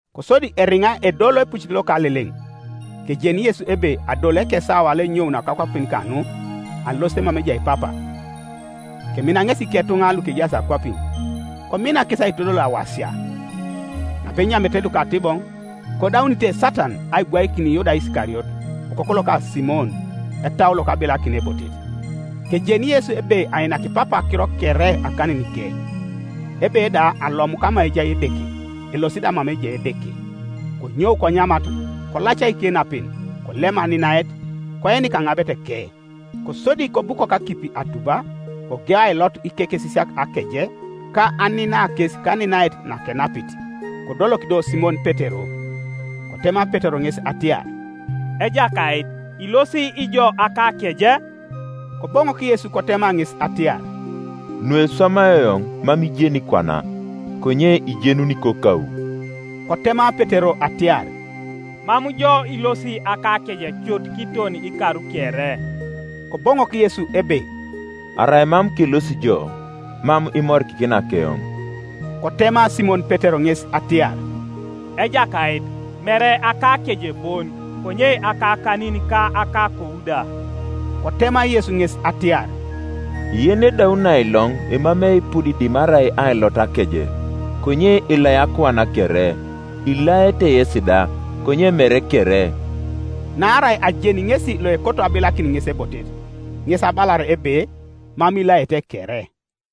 Kosodi eriŋa edolo epucit loka Aleleŋ, kejeni Yesu ebe adolu ekesawa loenyounio kakwapin kanu alosit mama ejai Papa, kemina ŋesi iketuŋa lukejaas akwapin, komina kes aitodol awasia. Napenyamete lukatiboŋ, kodaunite Satan aibwaikin Yuda Isikariot, okoku loka Simon, etau lokabilakin ebotet, kejeni Yesu ebe ainaki Papa akiro kere akaninike, ebe da alomu kama ejai Edeke, elosi da mama ejai Edeke, konyou konyamat, kolaca ikenapen; kolem aninaet, koenik aŋabeteke. Kosodi kobukok akipi atuba, kogeu ailot ikekesisiak akeje, ka anina kes kaninaet nakenapit. Kodolok do Simon Petero. Kotema Petero ŋes atiar, “Ejakait, ilosi ijo akakeje?” Koboŋok Yesu kotema ŋes atiar, “Nueswamai eoŋ mam ijeni kwana, konye ijenuni kokau.” Kotema Petero atiar, “Mam jo ilosi akakeje cut kiton ikar kere.” Koboŋok Yesu ebe, “Arai mam kelosi jo, mam imorikikina keoŋ.” Kotema Simon Petero ŋes atiar, “Ejakait, mere akakeje bon, konye akakanin ka akakou da.” Kotema Yesu ŋes atiar, “Yenedauni ailoŋ emamei eipud dimarai ailot akeje, konye elai akuan kere: ilaete yesi da, konye mere kere.” Naarai ajeni ŋesi loekoto abilakin ŋes ebotet; ŋes abalar ebe, “Mam ilaete kere.”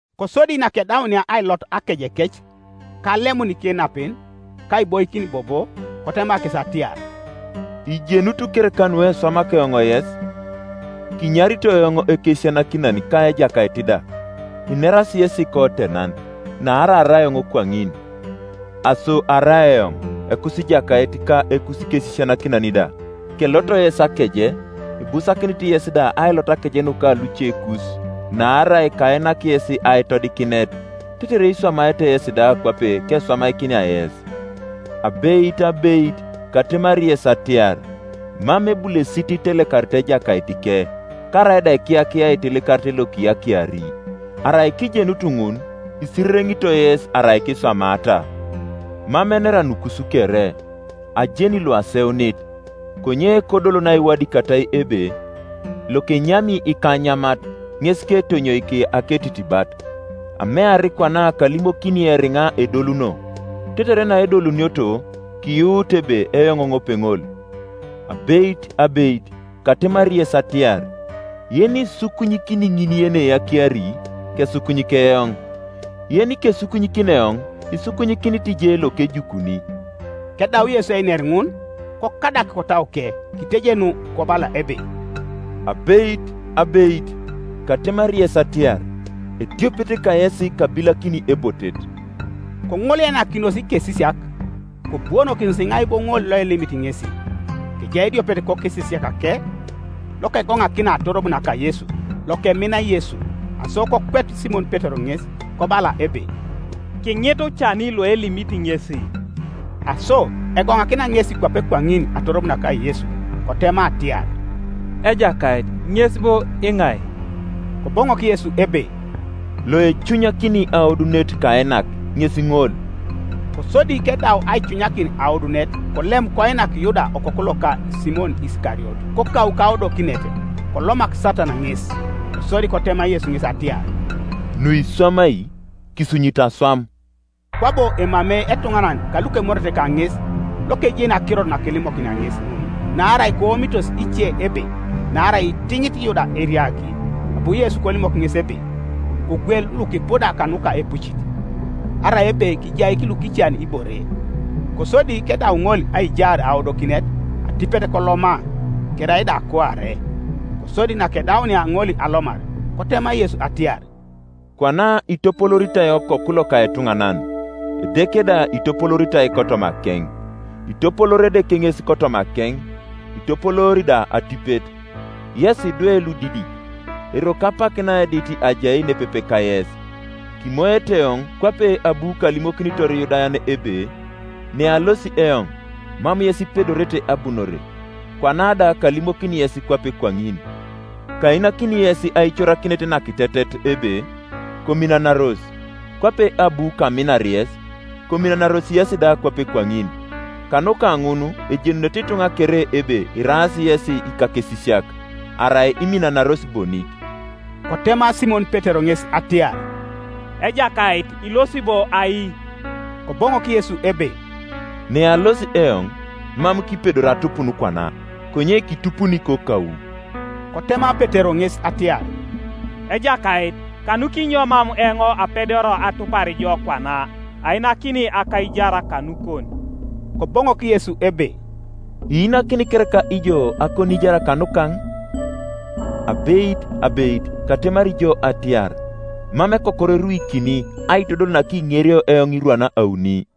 Kosodi nakedaunia ailot akejekec, ka alemun ikenapen, ka aiboikin bobo, kotema kes atiar, “Ijenut kereka nukeswamak eoŋ yes? Kinyarito eoŋ Ekesisianakinan ka Ejakait da; inerasi yesi kotenan, naarai arai eoŋ kwaŋin. Aso arai eoŋ, Ekusijakait ka Ekusikesisianakinan da, kelot yes akeje, ibusakinit yes da ailot akeje nuka lucekus. Naarai kainak yes aitodikinet, tetere iswamaete yesi da kwape keswamakinia yes. Abeit, abeit, katemari yes atiar, Mam ebulesit itelekarit ejakaitike; karaida ekiyakia aitelekarit lokiyakiari. Arai kijenutu ŋun, isirereŋitoi yes arai kiswamata. Mam enera nukus kere: ajeni luaseunit; konye kodol naiwadikatai ebe, ‘Lokenyami ikanyamat, ŋes ketonyoik aketitibat.’ Amear kwana kalimokini eriŋa edoluno, tetere naedolunioto, kiyuut ebe eoŋ ŋopeŋol. Abeit, abeit, katemari yes atiar, Yenisukunyikini ŋin yeneyakiari, kesukunyik eoŋ; yenikesukunyikini eoŋ isukunyikinit je lokejukuni.” Kedau Yesu einer ŋun, kokadak kotauke, kitejenu kobala ebe, “Abeit, abeit, katemari yes atiar, ediopet kayesi kabilakini ebotet.” Koŋoleanakinos ikesisiak, kobuonokinos iŋai bo ŋol loelimit ŋesi. Kejai ediopet kokesisiakake lokegoŋakina atorob naka Yesu, lokemina Yesu. Aso kokwet Simon Petero ŋes, kobala ebe, “Kiŋitu cani loelimit ŋesi.” Aso egoŋakina ŋesi kwape kwaŋin atorob naka Yesu, kotema atiar, “Ejakait, ŋes bo iŋai?” Koboŋok Yesu ebe, “Loecunyakini aodunet kainak, ŋes ŋol.” Kosodi kedau aicunyakin aodunet, kolem koinak Yuda okoku loka Simon Isikariot. Kokau kaodokinet, kolomak Satan ŋes, Kosodi kotema Yesu ŋes atiar, “Nuiswamai, kisunyite aswam.” Kwabo emamei etuŋanan kalukemorete kaŋes lokejeni akirot nakelimokinia ŋes ŋun. Naarai koomitos ice ebe naarai itiŋit Yuda eriagi, abu Yesu kolimok ŋes ebe, “Kogwel lukipuda kanuka epucit,” arai ebe kijaik lukican ibore. Kosodi kedau ŋol aijaar aodokinet, atipet koloma: kerai da kuare. Kosodi nakedaunia ŋol alomar, kotema Yesu atiar, “Kwana itopolooritai Okoku loka etuŋanan; Edeke da itopolooritai kotomakeŋ. Itopoloori Edeke ŋes kotomakeŋ, itopoloori da atipet. Yes idwe ludidik, eroko apak naedit ajai nepepe kayes. Kimoete eoŋ; kwape abu kalimokinitor Iyudayan ebe, ‘Nealosi eoŋ, mam yes ipedorete abunore’; kwana da kalimokini yes kwape kwaŋin. Kainakini yes aicorakinet nakitetet ebe, Kominanaros; kwape abu kaminar yes, kominanaros yesi da kwape kwaŋin. Kanuka ŋun ejenunete ituŋa kere ebe iraas yesi ikakesisiak, arai iminanaros bonik.” Kotema Simon Petero ŋes atiar, “Ejakait, ilosi bo ai?” Koboŋok Yesu ebe, “Nealosi eoŋ, mam kipedori atupun kwana; konye kitupuni kokau.” Kotema Petero ŋes atiar, “Ejakait, kanukinyo mam eoŋ apedoria atupar jo kwana? Ainakini akaijar kanukon.” Koboŋok Yesu ebe, “Iinakini kereka ijo akoniijar kanukaŋ? Abeit, abeit, katemari jo atiar, Mam ekokor eruikini, aitodol nakiŋerio eoŋ irwan auni.